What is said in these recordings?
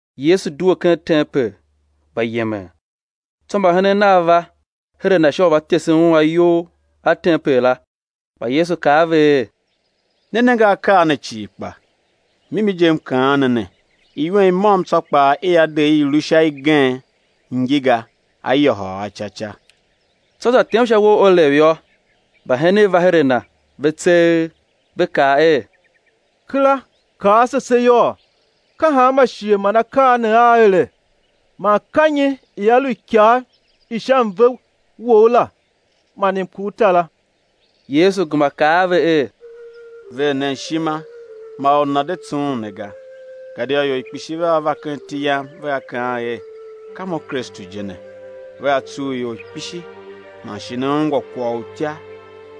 Yesu due ken tempel, gba yemen. Tsô mbahenen Nav va her a Na sha u va tesen Un ayou a tempel la. Kpa Yesu kaa a ve er: Ne nenge akaa ne cii kpa? Mimi je M kaan ne ne, iwen i môm tsô kpaa i á de i i̱ lu sha igen ngi ga, á yôhôl a ca ca. Tsô za tem sha uwo u Olev yô, mbahenen va her a Na, ve tseegh, ve kaa er: Kera kaa ase se yôô, ka hanma shighe man akaa ne aa ere? Man ka nyi ia lu ikav i sha mve Wou la man i mkurtara? Yesu gema kaa a ve er: Ver nen ishima, ma or nana̱ de tsughun ne ga. Gadia ior kpishi vea va ken iti Yam, vea kaan er: Ka mo Kristu je ne; vea tsugh ior kpishi. Man shi né ungwa kwagh u utya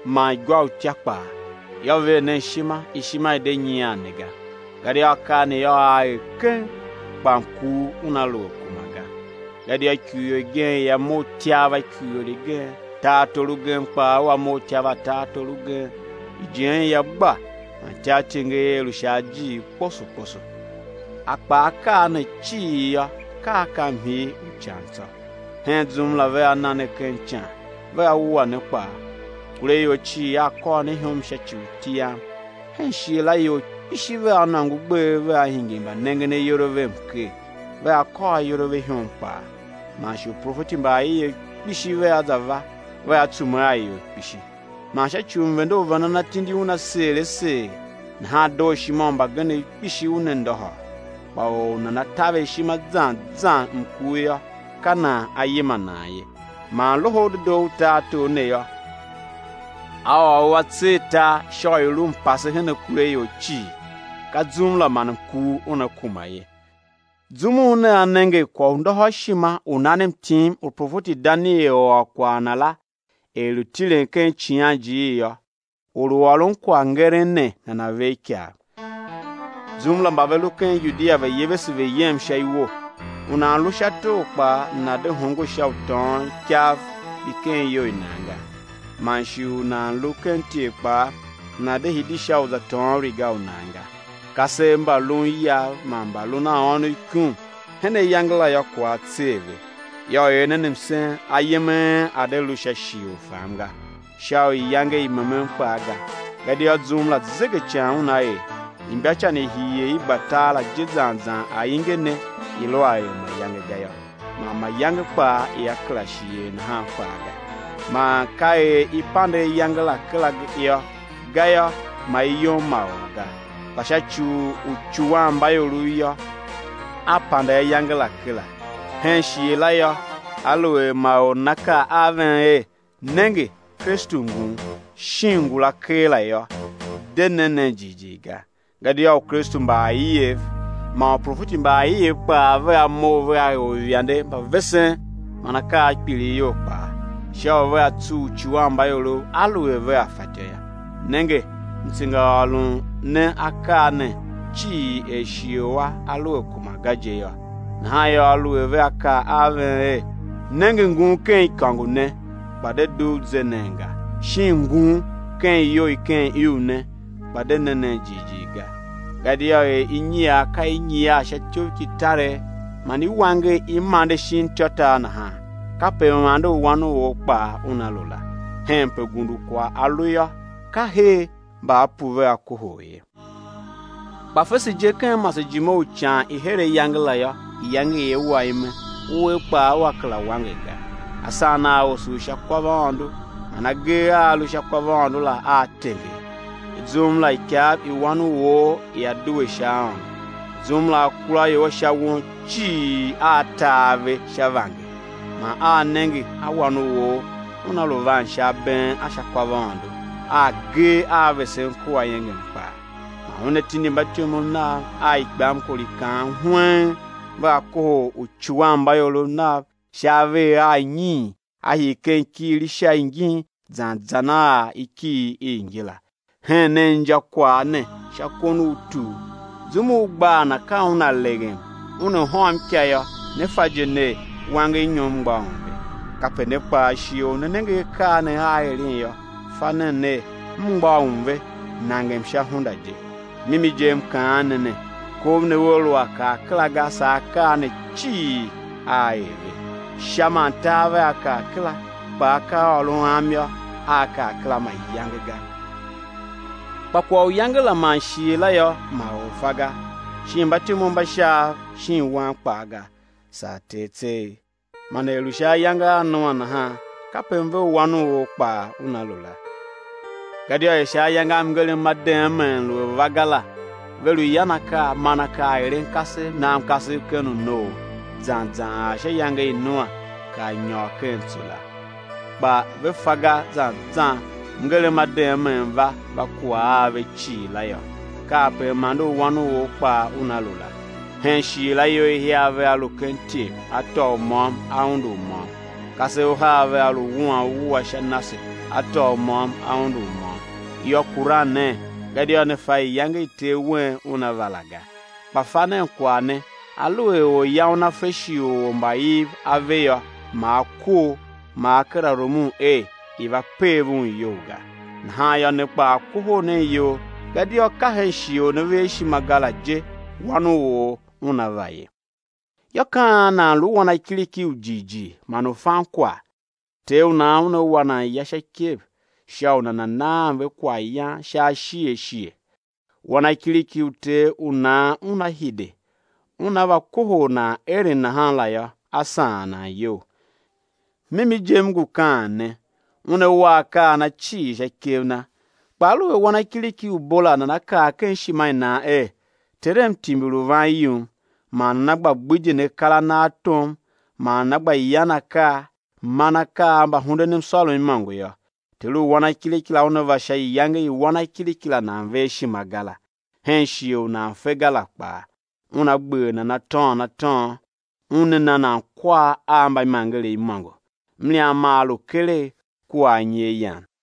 man igwa i utya kpaa; yô, ver nen ishima, ishima i̱ de nyian ne ga; gadia akaa ne yô, aa er keng, kpa mkur una lu a kuma ga. Gadia ikurior igen; ia mough ityav a ikurior i gen; tartor ugen kpaa ua mough ityav a tartor ugen; ijen ia gba man ityartenger ia lu sha ajiir kposo kposo. Kpa akaa ne cii yô, ka a ka mhii u ican tsô. Hen zum la vea na ne ken ican, vea wua ne kpaa; akuraior cii aa kôr ne ihom sha ci u iti Yam. Hen shighe la ior kpishi vea nôngo gbev vea hingir mbanengen ayol a ve mker, vea kôr ayol a ve ihom kpaa. Man shi uprofeti mba aiev kpishi vea za va, vea tsume a ior kpishi. Man sha ci u mvende u vendan atindi una seer a seer nahan dooshima u mbagenev kpishi una ndôhôr. Kpa or u nana taver ishima zan zan mkur yô, ka nan á yima nan ye. Man Loho u Dedoo u tartor ne yô, á ôr u á tser tar, sha u u̱ lu mpase hen akuraior cii; ka zum la man mkur una kuma ye. Zum u nea nenge kwaghndôhôrshima u nan mtim u profeti Daniel ôr kwagh na la, er lu tilen ken icighanjiir yô, (or u ôron kwaghngeren ne nana̱ ver ikav) zum la, mba ve lu ken Yudia, ve̱ yevese ve̱ yem sha iwo. U nan lu sha tor kpaa, nana̱ de hongo sha u tôôn ikav mbi ken iyou i nan ga; man shi u nan lu ken ityev kpaa, nana̱ de hidi sha u za tôôn riga u nan ga. Kasev mba lun iyav man mbalun a ônov ikum hen ayange la yô, kwagh á tser ve. Yô, er nen msen, ayem a en a̱ de lu sha shighe u fam ga, sha iyange i memen kpaa ga. Gadia zum la zegecan una er, imbacan i hii er i gba tar la je zan zan ainge ne i lu a er mayange ga yô, man mayange kpaa ia kera shi er nahan kpaa ga. Man ka er i pande ayange la kera yô, gayô, ma i yom ma or ga; kpa sha ci u uicuwanmbaiorov yô, á pande ayange la kera. Hen shighe la yô, aluer ma or nana kaa a ven er: Nenge, Kristu ngun; shin, ngula keela yô, de ne nen jighjigh ga. Gadia ukristu mba aiev man uprofeti mba aiev kpaa vea mough vea er uivande mba vesen man akaa a kpilighyol kpaa, sha u vea tsugh uicuwanmbaiorov aluer vea fatyô yô. Nenge, M tsengaôron ne akaa ne cii er shighe u a a lu a kuma ga je yô. Nahan yô, aluer vea kaa a ven er: Nenge ngun ken ikôngo ne, kpa de dugh, ze nen ga; shin: Ngun, ken iyou i ken iuv ne, kpa de ne nen jighjigh ga. Gadia er inyiar ka i nyiar sha ityoughkitaregh man i wanger i mande shin ityôtar nahan kape m-ande u Wan u or kpaa una lu la. Henpe gundukwagh a lu yô, ka her mbaapu vea kohol ye. Kpa fese je, ken masejime u ican i her ayange la yô, iyange ia wa ime, uwer kpaa ua kera wanger ga; asan aa osough sha kwavaôndo man agee a a lu sha kwavaôndo la aa tenger. Tsô zum la ikav i Wan u or ia due sha aôndo. Zum la akuraior a sha won cii aa ta ave sha vanger, man aa nenge a Wan u or Una lu van sha abeen a sha kwavaôndo a agee a vesen kua iengem kpaa. Man Una tindi mbatyomov Nav a ikpamkor i kaan hweng, vea kohol uicuwanmbaiorov Nav sha avegher anyiin á hii ken ikighir ingila. Hen nen injakwagh ne sha kon u tur. Zum u gbaa na ka una leghem una hôm ika yô, ne fa je ner, wangernyom mgbôghom ve. Kape ne kpaa, shighe u né nenge akaa ne aa eren yô, fa nen ner, a mgbôghom ve, nangem sha hunda je. Mimi je M kaan ne ne, kov ne ua lu a kar kera ga saa akaa ne cii aa er ve. Sha man tar vea kar kera, kpa akaaôron Am yô, aa kar kera mayange ga. Kpa kwagh u iyange la man shighe la yô, ma or fa ga, shin mbatyomov mba Shaav shin Wan kpaa ga, saa Ter tseegh. Man er lu sha ayange a Noa nahan, kape mve u Wan u or kpaa una lu la. Gadia er sha ayange a mngerem ma deemee lu a va ga la ve lu yan akaa, man akaa, eren kasev, nan kasev ken unoo zan zan ar sha iyange i Noa kar nyôr ken tso la, kpa ve fa ga zan zan mngerem ma deemee va, va kuwa a ve cii la yô, kape m-ande u Wan u or kpaa una lu la. Hen shighe la ior ihiar vea lu ken ityev, á tôô u môm á undu u môm; kasev uhar vea lu wuan uwua sha nase, á tôô u môm á undu u môm. Yô, kuran nen, gadia ne fa iyange i Ter wen Una va la ga. Kpa fa nen kwagh ne: Aluer orya una fe shighe u ormbaiv a ve yô, ma a kor, ma a kera rumun er i̱ va pev un iyou ga. Nahan yô, ne kpaa kohol nen iyol gadia ka hen shighe u ne ver ishima ga la je, Wan u or Una va ye. Yô, ka an nan lu wanakiriki u jighjigh man u fan kwagh u ter u nan una wa nan ya sha ikev sha u nana naan ve kwaghyan sha ashighe ashighe? Wanakiriki u ter u nan una hide, una va kohol nan eren nahan la yô, á saan nan iyol. Mimi je M ngu kaan ne, una wa akaa a na cii sha ikev na. Kpa aluer wanakiriki u bo la nana kaa ken ishima i nan er: Terem timbir u van yum man nana gba gbidyen akar a na a tom, man nana gba yan akaa, man akaa a mbahundenmsôrom imôngo yô, ter u wanakiriki la una va sha iyange i wanakiriki la nan ver ishima ga la, hen shighe u nan fe ga la kpaa; una gber nan atôôn atôôn, una na nan kwar a mbaimangerev imôngo; mliam maa lu keregh kua anyi a yan.